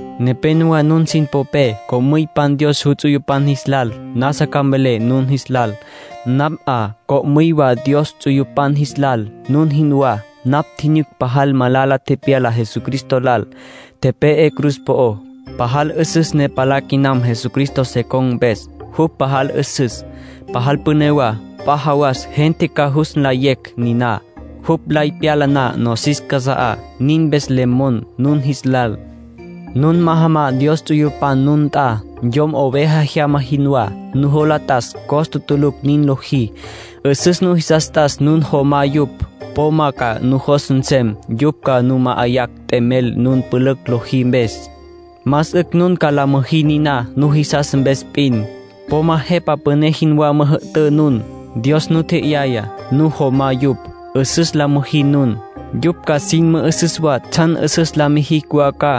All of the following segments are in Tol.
Nepénowa nun sin popé co'müypan Dios ts'uyupan jis lal. Nasa ca mvelé nun jis lal. Napj 'a co'müy wa Dios ts'uyupan jis lal, nun jinwá. Napj tjinyuc pajal malala tepyala Jesucristo lal, tepe'e cruz po'ó. Pajal 'üsüs ne palá quinam Jesucristo se con̈ mpes. Jupj pajal 'üsüs, pajal püné wa. P'a jawas gente ca jus nlayecj niná, jupj lay pyala na nosis casa'á. Nin mpes le mon nun jis lal nun majamá Dios ts'uyupan nun nt'a, yom oveja jyama jinwá. Nujola t'as costa tulucj nin lojí. 'Üsüs nujisas t'as nun jomá yupj. Po ma ca nujos nsem yupj ca nu ma'ayacj t'emel nun pülücj lojí mpes. Más 'ücj nun ca la müjí niná nujisas mpes p'in. Po ma jepa püné jinwá müjü'tǘ nun. Dios nu tje'yaya nun jomá yupj. 'Üsüs la müjí nun, yupj ca sin mü'üsüs wa tsjan 'üsüs la mijicj wa ca.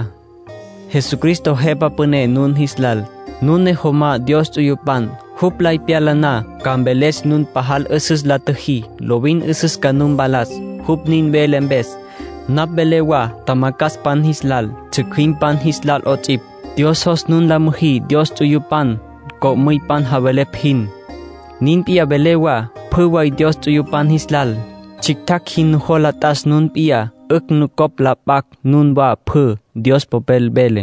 Jesucristo Jepa Püné nun jis lal, nun ne jomá Dios ts'uyupan. Jupj lay pyala na, ca mveles nun pajal 'üsüs la tjüjí. Lovin 'üsüs ca nu mpalas, jupj nin vele mpes. Napj velé wa tjamacjaspan jis lal, tsjücjüimpan jis lal 'ots'ipj. Dios jos nun la müjí Dios ts'uyupj co'müypan javelepj jin. Nin p'iyá velé wa pjü way Dios ts'uyupan jis lal. Tsjictjacj jin nujola t'as nun p'iyá, 'ücj nucopj la p'acj nunwa pjü. Dios Popel vele: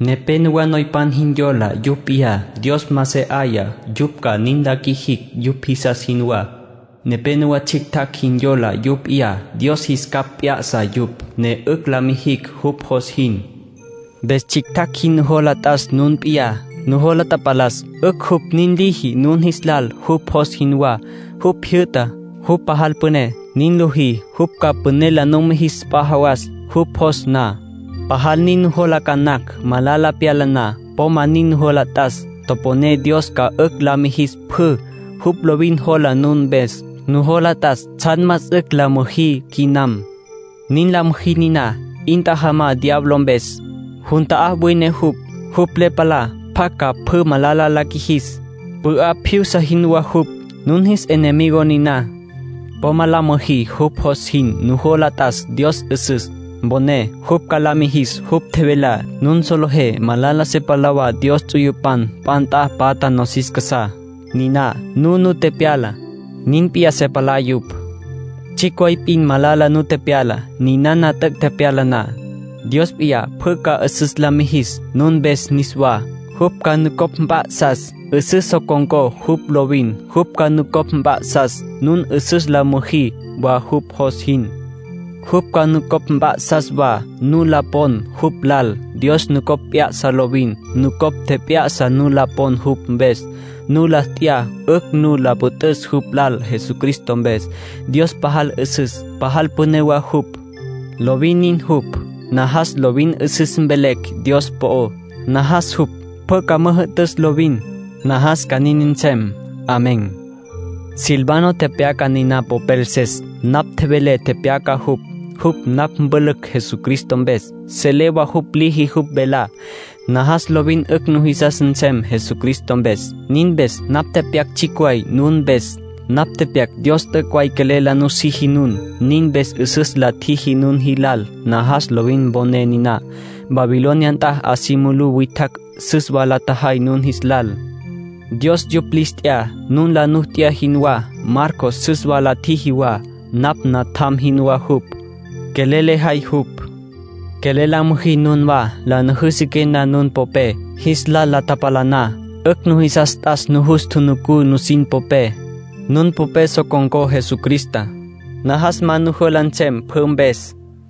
“Nepénowa noypan jin yola yupj p'iyá. Dios ma se 'aya yupj ca nin la qjuijicj yupj jisas jinwá. Nepénowa tsjictjacj jin yola yupj p'iyá. Dios jis capj p'ya'sa yupj, ne 'ücj ca la mijicj jupj jos jin.” Mpes tsjictjacj jin nujola t'as nun p'iyá. Nujola tapalas 'ücj jupj nin liji nun jis lal jupj jos jinwá. Jupj jyü'ta. Jupj pajal püné. Nin lojí, jupj ca püné la numijis p'a jawas, jupj jos na. Pajal nin nujola ca nacj, malala pyala na. Po ma nin nujola t'as. Toponé Dios ca 'ücj la mijis pjü. Jupj lovin jola nun mpes. Nujola t'as tsjan más 'ücj la müjí quinam. Nin la müjí niná. 'In tjajama diablo mpes. Jun ta'á wine jupj. Jupj le palá pjacj ca pjü malala la qjuijis. Pü'á pjyusa jinwá jupj. Nun jis enemigo niná. Po ma la müjí jupj jos jin. Nujola t'as Dios 'üsüs. Mponé jupj ca la mijis jupj tjevelá. Nun solejé malala se palá wa Dios ts'uyupan p'a nt'a patja nosis casá. Niná nun nu tepyala, nin p'iyá se palá yupj. Tsjicj way p'in malala nu tepyala. Ninana t'üc' tepyala na, Dios p'iyá pjü ca 'üsüs la mijis nun mpes niswá. Jupj ca nucopj mp'a'sas 'üsüs so con̈có jupj lovin. Jupj ca nucopj mp'a'sas nun 'üsüs la müjí wa jupj jos jin. Jupj ca nucopj mp'a'sas wa nu la pon jupj lal. Dios nucopj p'ya'sa lovin. Nucopj tjep'ya'sa nu la pon jupj mpes. La nu t'ya 'ücj nu la püt'üs jupj lal Jesucristo mpes. Dios pajal 'üsüs; pajal püné wa jupj. Lovin nin jupj. Najas lovin 'üsüs velecj Dios po'ó. Najas jupj pjü ca müjü'tüs lovin. Najas ca nin nsem. Amén. Silvano tepyaca ninana popelses. Napj tjevelé tepyaca jupj. Jupj napj mpülücj Jesucristo mpes. Selé wa jupj liji jupj velá. Najas lovin 'ücj nujisas nsem Jesucristo mpes, nin mpes napj tepyac tsjicj way nun mpes. Napj tepyac Dios t'üc' way quelel la nusiji nun, nin mpes 'üsüs la tjiji nun jilal. Najas lovin mponé niná. Babilonia nt'a 'a si mulú witjacj süs wa la tjajay nun jis lal. Dios yupj lis t'ya, nun la nu t'ya jinwá. Marcos süs wa la tjiji wa. Napj natjam jinwá jupj; quelel lejay jupj. Quelel la müjí nunwá. La nüjüsüqué na nun popé, jis lal la tjalapaná. 'Ücj nujisas t'as nujus tjunucú nusin popé. Nun popé so con̈có Jesucristá, najas ma nujola nsem pjü mpes.